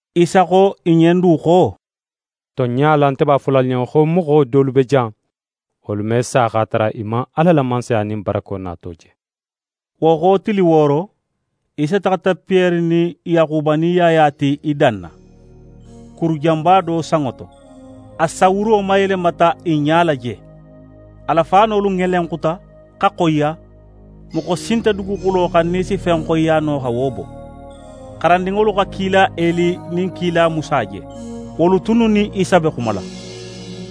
Isa xo i ɲen du xo: «Tonɲa la, nte b'a fola alu ɲen xo moxo dolu be jan, wolu me sa x'a tara i man Ala la Mansaya nin barako nato je.» Wo xo tili wooro, Isa taxata Piyere nin Yaxuba nin Yaya ti i danna, kuru janba do sanŋo to. A sawuro mayelemata i ɲala je. A la faanolu ŋelenxuta, xa xoyiya, moxo si nte duguxulo xan nin í si fen xoyiya no xa wo bo. xarandinŋolu xa kila Eli nin kila Musa je. Wolu tunnu nin Isa be xumala.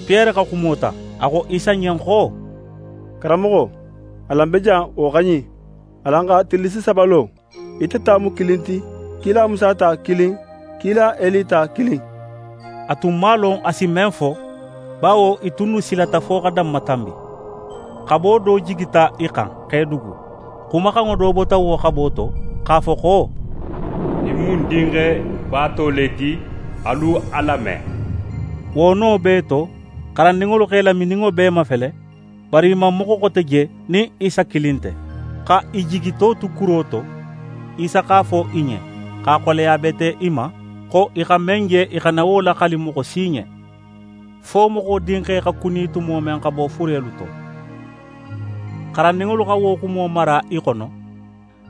Piyere xa xumo ta, a xo Isa ɲen xo: «Karanmoxo, alan be jan, wo xa ɲin. Alan xa tillisi saba lo, ite ta mu kilin ti, kila Musa ta kilin, kila Eli ta kilin.» A tun man a lon a si men fo, bawo i tunnu silata fo xa danmatanbi. Xabo do jigita i xan, x'e dugu. Xumaxanŋo do bota wo xabo to, x'a fo xo: «Ɲin mu ń Dinxe baato le ti. Alu a lame.» Wo no bee to, xarandinŋolu x'e lamininŋo bee mafele, bari i man moxo xote je nin Isa kilin nte. Xa i jigito tu kuro to, Isa x'a fo i ɲen, x'a xoleya bete i ma, xo i xa men je, i xana wo laxali moxo si ɲen, fo Moxo Dinxe xa kuni tumo men xa bo furelu to. Xarandinŋolu xa wo xumo mara i xono,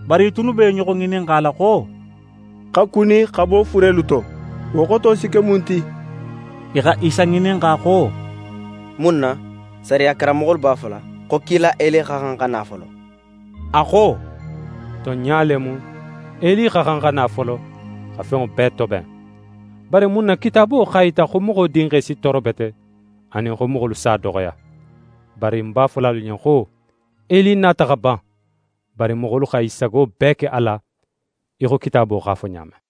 bari i tunnu be i ɲoxo ŋininxala xo: «Xa kuni xa bo furelu to, wo xoto si ke mun ti?» I xa Isa ŋininxa xo: «Mun na sariya karanmoxolu b'a fola xo kila Eli xa xan xa na folo?» A xo: «Tonɲa le mu, Eli xa xan xa na folo, xa fenŋo bee toben. Bari mun na Kitaabo x'a yita xo Moxo Dinxe si tooro bete, anin xo moxolu s'a doxoya? Bari ń b'a fola alu ɲen xo: Eli nata xa ban, bari moxolu xa i sago bee ke a la, í xo Kitaabo x'a fo ɲa men.»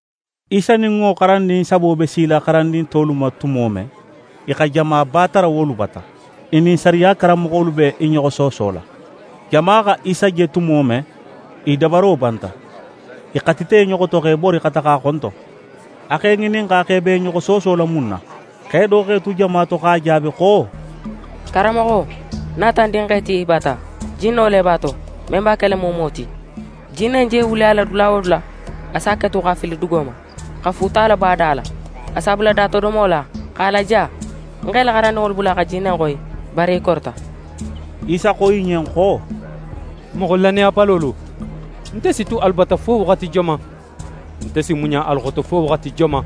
Isa nin wo xarandin sabo be sila xarandin tolu ma tumo men, i xa jamaba tara wolu bata. I nin sariya karanmoxolu be i ɲoxo soosola. Jama xa Isa je tumo men, i dabaro banta, i xatita i ɲoxo to, x'e bori xa taxa a xonton. A x'e ŋininxa xo i be i ɲoxo soosola mun ma. Xe do x'é tu jama to x'a jaabi xo: «Karanmoxo, ń nata ń dinxe ti í bata. Jinno le b'a to, men b'a kela muumuwo ti. Jinne in je wuli a la dula wo dula, a s'a ketu x'a fili dugo ma, xa fuuta labo a da la. A s'a bula datodomo la, x'a laja. Ń x'é la xarandinŋolu bula xa jinne in xoyi, bari i korita.» Isa xo i ɲen xo: «Moxo lannayabalolu, nte si tu alu bata fo waxati joman? Nte si muɲa alu xoto fo waxati joman?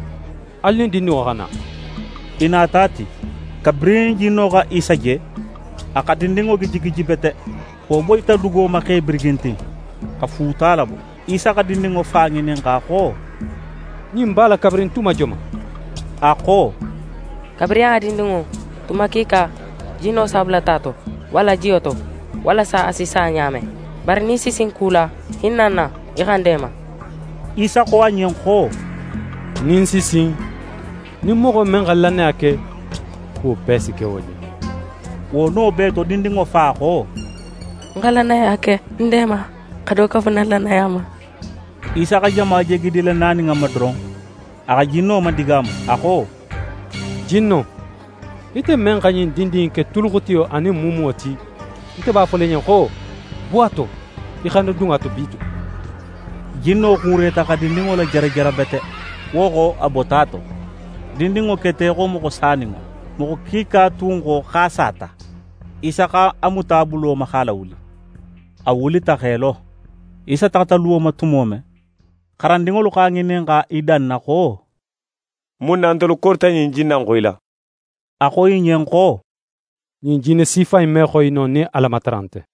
Alu nin dindinŋo xa na.» I nata a ti. Kabirin jinno xa Isa je, a xa dindinŋo gijigiji bete. Wo boyita dugo ma x'é birigintin, xa fuuta labo. Isa xa dindinŋo fa ŋininxa xo: «Ɲin b'a la kabirin tuma joman?» A xo: «Kabirin a dindinŋo. Tuma kiika, jinno s'a bula ta to, walla jiyo to, walasa a si sa ɲa men. Bari nin í si sin ku la, hinna ń na, í xa ń deema.» Isa xo a ɲen xo: «Nin ń si sin! Nin moxo men xa lannaya ke, kuwo bee si ke wo ɲen.» Wo no bee to, dindinŋo fa xo: «Ń xa lannaya ke. Ń deema, xa do kafu ń na lannaya ma.» Isa xa jama je gidila nanin i ma doron, a xa jinno madigaamu. A xo: «Jinno, ite men xa ɲin dindin in ke tuluxutiyo anin muumuwo ti, nte b'a fola í ɲen xo: Bo a to, í xana dun a to bitugun!» Jinno xuureta xa dindinŋo lajarajara bete, wo xo, xa bo a to. Dindinŋo keta í xo moxo saninŋo. Moxo kiika tun xo x'a sata. Isa x'a muta a bulo ma, x'a lawuli. A wulita x'é lo. Isa taxata luwo ma tumo men, xarandinŋolu x'a ŋininxa i danna xo: «Mun na ntelu korita ɲin jinne in xoyila?» A xo i ɲen xo: «Ɲin jinne sifa in me xoyi no, nin Alamatara nte.»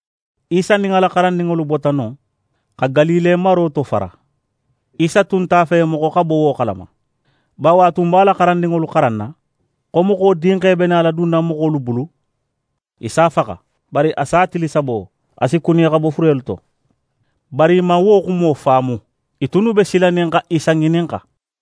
Isa nin a la xarandinŋolu bota non, xa Galile maro tofara. Isa tun nte a fe moxo xa bo wo xalama. Bawo a tun be a la xarandinŋolu xaranna, xo Moxo Dinxe be nala dunna moxolu bulu. I s'a faxa. Bari a sa tili sabo, a si kuni xa bo furelu to. Bari i man wo xumo faamu. I tunnu be silanin xa Isa ŋininxa.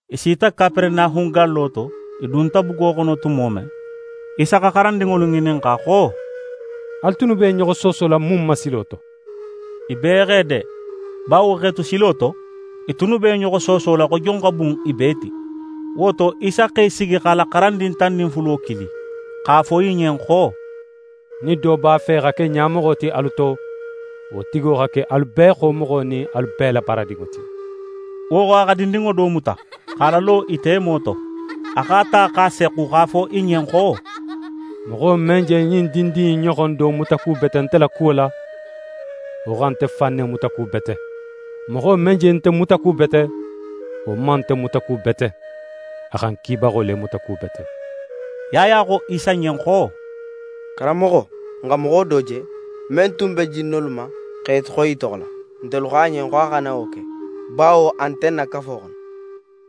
I sita Kaperenahun gallo to. I dunta bugo xono tumo men, Isa xa xarandinŋolu ŋininxa xo: «Alu tunnu be i ɲoxo soosola mun ma silo to?» I bee x'e de, bawo x'e tu silo to, i tunnu be i ɲoxo soosola xo jon xa bun i bee ti. Wo to, Isa x'é sigi, x'a la xarandin tan nin fulo kili, x'a fo i ɲen xo: «Nin do b'a fe xa ke ɲamoxo ti alu to, wo tigo xa ke alu bee xomoxo nin alu bee la baaradinŋo ti.» Wo xo, a xa dindinŋo do muta, x'a lalo i temo to. A x'a ta x'a sexxu, x'a fo i ɲen xo: «Moxo men je ɲin dindin in ɲoxon do mutakubete nte la kuwo la, wo xa nte fan ne mutakubete. Moxo men je nte mutakubete, wo man nte mutakubete, a xa ń Kibaxo le mutakubete.» Yaya xo Isa ɲen xo: «Karanmoxo, n xa moxo do je, men tun be jinnolu ma x'e xoyi í toxo la. Ntelu xo a ɲen xo a xana wo ke, bawo a tun nte n na kafo xono.»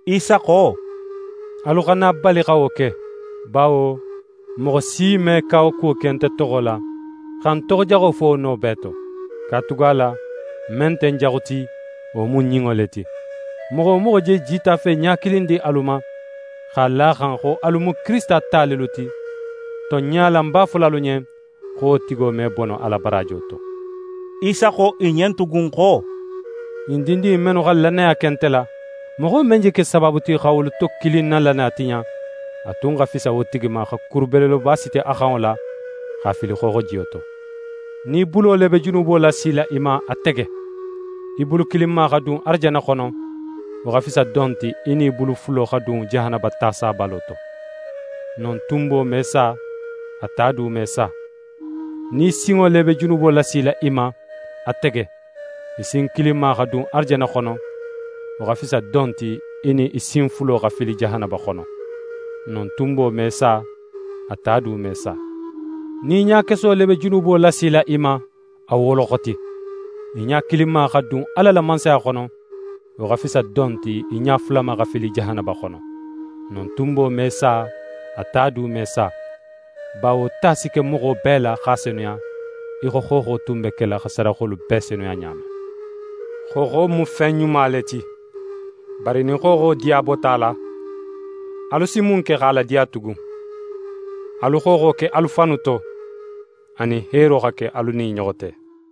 Isa xo: «Alu xana a bali xa wo ke, bawo moxo si me kawakuwo ke nte toxo la, xa ń toxojaxo fo wo no bee to. Katugala men nte n jaxu ti, wo mu n ɲinŋo le ti. Moxo wo moxo je jitafe ɲa kilin di alu ma, x'a la a xan xo alu mu Kirisita ta lelu ti, tonɲa la, ń b'a fola alu ɲen xo wo tigo me bono a la baraajo to.» Isa xo i ɲen tugun xo: «Ɲin dindin in mennu xa lannaya ke nte la, moxo men je ke sabaabu ti, xa wolu to kilin na lannaya tiɲa, a tun xa fisa wo tigi ma, xa kuru belebeleba siti a xanŋo la, x'a fili xooxojiyo to. Nin í bulo le be junubo lasila í ma, a tege; í bulu kilinma xa dun arajanna xono, wo xa fisa don ti, í nin í bulu fulo xa dun jahanaba ta sabalo to. [ Non “tunbo me sa, a ta du me sa.”] Nin í sinŋo le be junubo lasila í ma, a tege; í sin kilinma xa dun arajanna xono, wo xa fisa don ti, í nin í sin fulo xa fili jahanaba xono. [ Non “tunbo me sa, a ta du me sa.”] Nin í ɲakeso le be junubo lasila í ma, a woloxoti; í ɲa kilinma xa dun Ala la Mansaya xono, wo xa fisa don ti, í ɲa fulama xa fili jahanaba xono. Non “tunbo me sa, a ta du me sa.” Bawo ta si ke moxo bee la, x'a senuya í xo xooxo tun be kela xa sadaxolu bee senuya ɲa men. «Xooxo mu fen ɲuma le ti; bari nin xooxo diya bota a la, alu si mun ke x'a ladiya tugun? Alu xooxo ke alu fannu to, anin heero xa ke alu nin i ɲoxo te.»